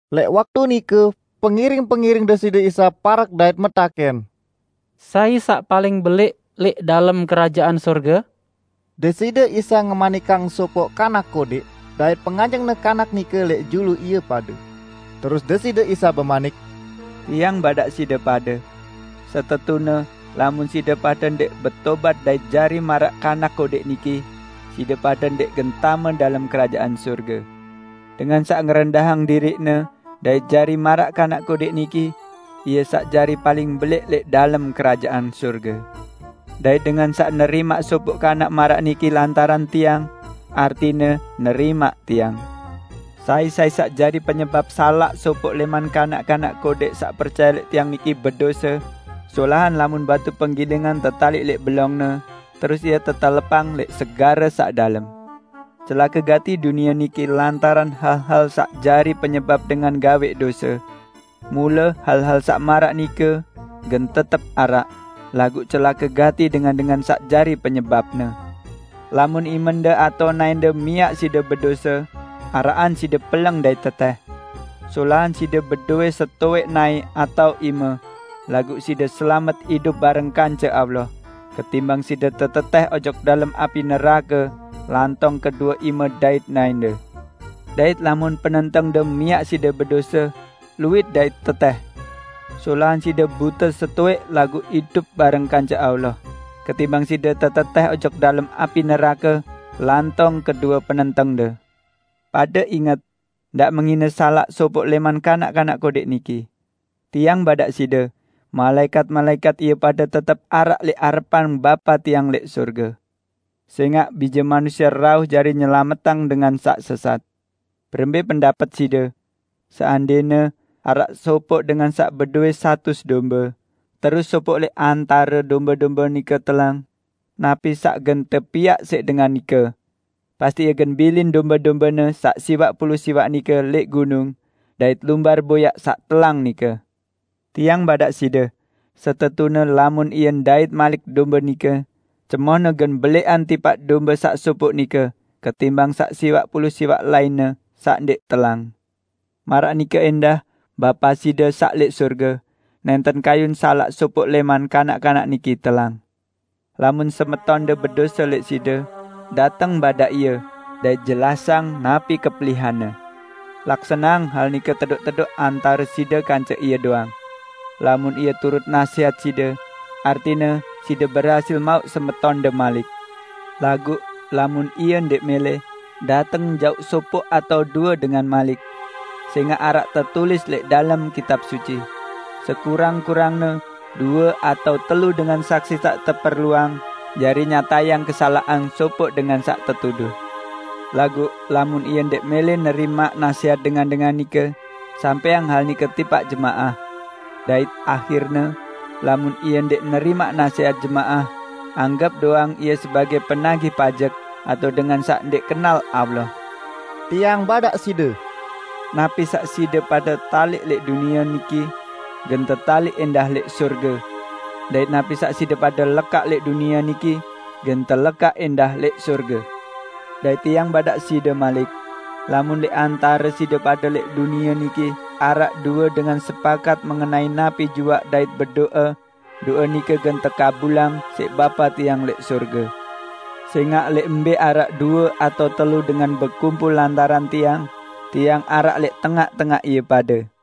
Lẽq waktu nike pengiring-pengiring Deside Isa parek dait metakẽn, "Sai saq paling belẽq lẽq dalem Kerajaan Sorge?" Deside Isa ngemanikang sopoq kanak kodẽq, dait penganjeng-Ne kanak nike lẽq julu ie pade. Terus Deside Isa bemanik, "Tiang badaq side pade! Setetune lamun side pade ndẽq betobat dait jari maraq kanak kodẽq niki, side pade ndẽq gen tame dalem Kerajaan Sorge. Dengan saq ngerendahang diriqne dait jari maraq kanak kodẽq niki, ie saq jari paling belẽq lẽq dalem Kerajaan Sorge. Dait dengan saq nerimaq sopoq kanak maraq niki lantaran Tiang, artine nerimaq Tiang." "Sai-sai saq jari penyebap salaq sopoq lẽman kanak-kanak kodẽq saq percaye lẽq Tiang niki bedose, solahan lamun batu penggilingan tetaliq lẽq belongne terus ie tetelepang lẽq segare saq dalem. Celake gati dunie niki lantaran hal-hal saq jari penyebap dengan gawẽq dose. Mule hal-hal saq maraq nike gen tetep araq, laguq celake gati dengan-dengan saq jari penyebapne! Lamun imende atao naẽnde miaq side bedose, araqan side peleng dait tetẽh. Solahan side bedowẽ setowẽq naẽ atao ime laguq side selamet idup bareng kance Allah, ketimbang side tetetẽh ojok dalem api nerake lantong kedue ime dait naẽnde. Dait lamun penentengde miaq side bedose, luwit dait tetẽh. Solahan side bute setowẽq laguq idup bareng kance Allah, ketimbang side tetetẽh ojok dalem api nerake lantong kedue penentengde." "Pade inget! Ndaq menghine salaq sopoq lẽman kanak-kanak kodẽq niki. Tiang badaq side, malaẽkat-malaẽkat ie pade tetep araq lẽq arepan Bapa Tiang lẽq sorge. [ Sẽngaq Bije Manusie rauh jari nyelametang dengan saq sesat!] Berembẽ pendapet side? Seandẽne araq sopoq dengan saq bedowẽ satus dombe, terus sopoq lẽq antare dombe-dombe nike telang. Napi saq gen tepiaq siq dengan nike? Pasti ie gen bilin dombe-dombene saq siwaq pulu siwaq nike lẽq gunung dait lumbar boyaq saq telang nike. Tiang badaq side, setetune lamun ie ndait malik dombe nike, cemohne gen belẽqan tipaq dombe saq sopoq nike ketimbang saq siwaq pulu siwaq lainne saq ndẽq telang. Maraq nike ẽndah Bapa side saq lẽq sorge, nẽnten kayun salaq sopoq lẽman kanak-kanak niki telang." "Lamun semetonde bedose lẽq side, dateng badaq ie dait jelasang napi kepelihanne. Laksaneang hal nike tedoq-tedoq antare side kance ie doang. Lamun ie turut nasẽhat side, artine side berhasil mauq semetonde malik. Laguq lamun ie ndẽq mẽlẽ, dateng jauq sopoq atao due dengan malik. Sẽngaq araq tetulis lẽq dalem Kitab Suci, 'Sekurang-kurangne due atao telu dengan saksi saq teperluang jari nyatayang kesalaqan sopoq dengan saq tetuduh.' Laguq lamun ie ndẽq mẽlẽ nerimaq nasẽhat dengan-dengan nike, sampẽang hal nike tipaq jemaah. Dait ahirne, lamun ie ndẽq nerimaq nasẽhat jemaah, anggep doang ie sebagẽ penagih pajek atao dengan saq ndẽq kenal Allah." Tiang badaq side: "Napi saq side pade taliq lẽq dunie niki, gen tetaliq ẽndah lẽq sorge. Dait napi saq side pade lekaq lẽq dunie niki, gen telekaq ẽndah lẽq sorge. Dait Tiang badaq side malik: Lamun lẽq antare side pade lẽq dunie niki araq due dengan sepakat mengenai napi juaq dait bedo'e, do'e nike gen tekabulang siq Bapa Tiang lẽq sorge. Sẽngaq lẽq mbẽ araq due atao telu dengan bekumpul lantaran Tiang, Tiang araq lẽq tengaq-tengaq ie pade."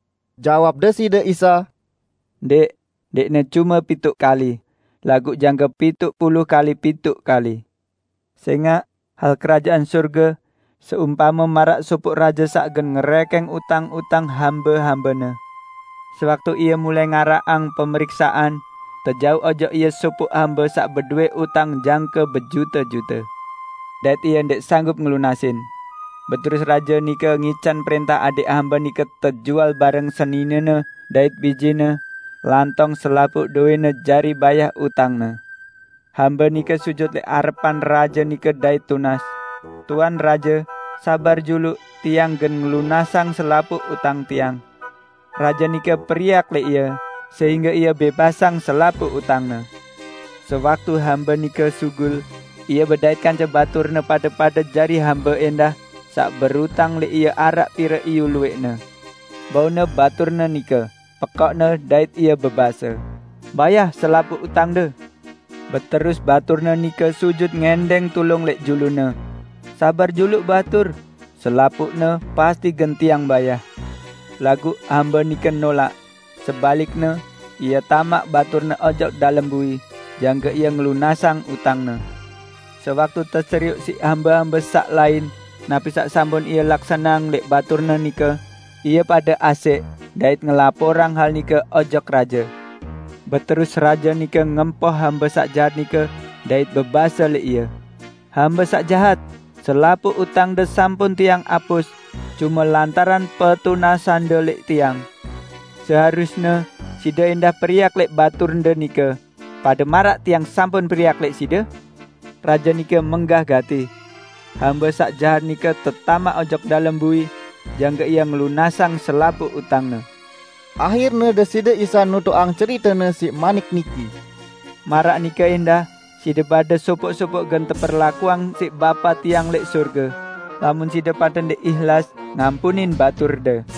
Jawab Deside Isa, "Ndẽq, ndẽqne cume pituq kali, laguq jangke pituq pulu kali pituq kali! Sẽngaq hal Kerajaan Sorge seumpame maraq sopoq raje saq gen ngerẽkẽng utang-utang hambe-hambene. Sewaktu ie mulai ngaraqang pemeriksaan, tejauq ojok ie sopoq hambe saq bedowẽ utang jangke bejute-jute, dait ie ndẽq sanggup ngelunasin. Beterus raje nike ngican prẽntah adẽq hambe nike tejual bareng seninene dait bijene, lantong selapuq dowẽne jari bayah utangne. Hambe nike sujut lẽq arepan raje nike dait tunas, 'Tuan raje, sabar juluq, tiang gen ngelunasang selapuq utang tiang.' Raje nike periak lẽq ie, sehingge ie bẽbasang selapuq utangne. Sewaktu hambe nike sugul, ie bedait kance baturne pade pade jari hambe ẽndah saq berutang lẽq ie araq pire iyu luwẽqne. Baune baturne nike, pekokne dait ie bebase, 'Bayah selapuq utangde!' Beterus baturne nike sujut ngẽndẽng tulung lẽq julune, 'Sabar juluq batur, selapuqne pasti gen tiang bayah!' Laguq hambe nike nolaq, sebalikne, ie tamaq baturne ojok dalem bui, jangke ie ngelunasang utangne. Sewaktu teserioq siq hambe-hambe saq lain napi saq sampun ie laksaneang lẽq baturne nike, ie pade asẽq dait ngelaporang hal nike ojok raje. Beterus raje nike ngempoh hambe saq jahat nike dait bebase lẽq ie, 'Hambe saq jahat! Selapuq utangde sampun tiang apus cume lantaran petunasande lẽq tiang. Seharusne side ẽndah periak lẽq baturde nike pade maraq tiang sampun periak lẽq side?' Raje nike menggah gati. Hambe saq jahat nike tetamaq ojok dalem bui jangke ie ngelunasang selapuq utangne." Ahirne Deside Isa nutuqang cerite-Ne siq manik niki, "Maraq nike ẽndah side pade sopoq-sopoq gen teperlakuang siq Bapa Tiang lẽq sorge, lamun side pade ndẽq ihlas ngampunin baturde."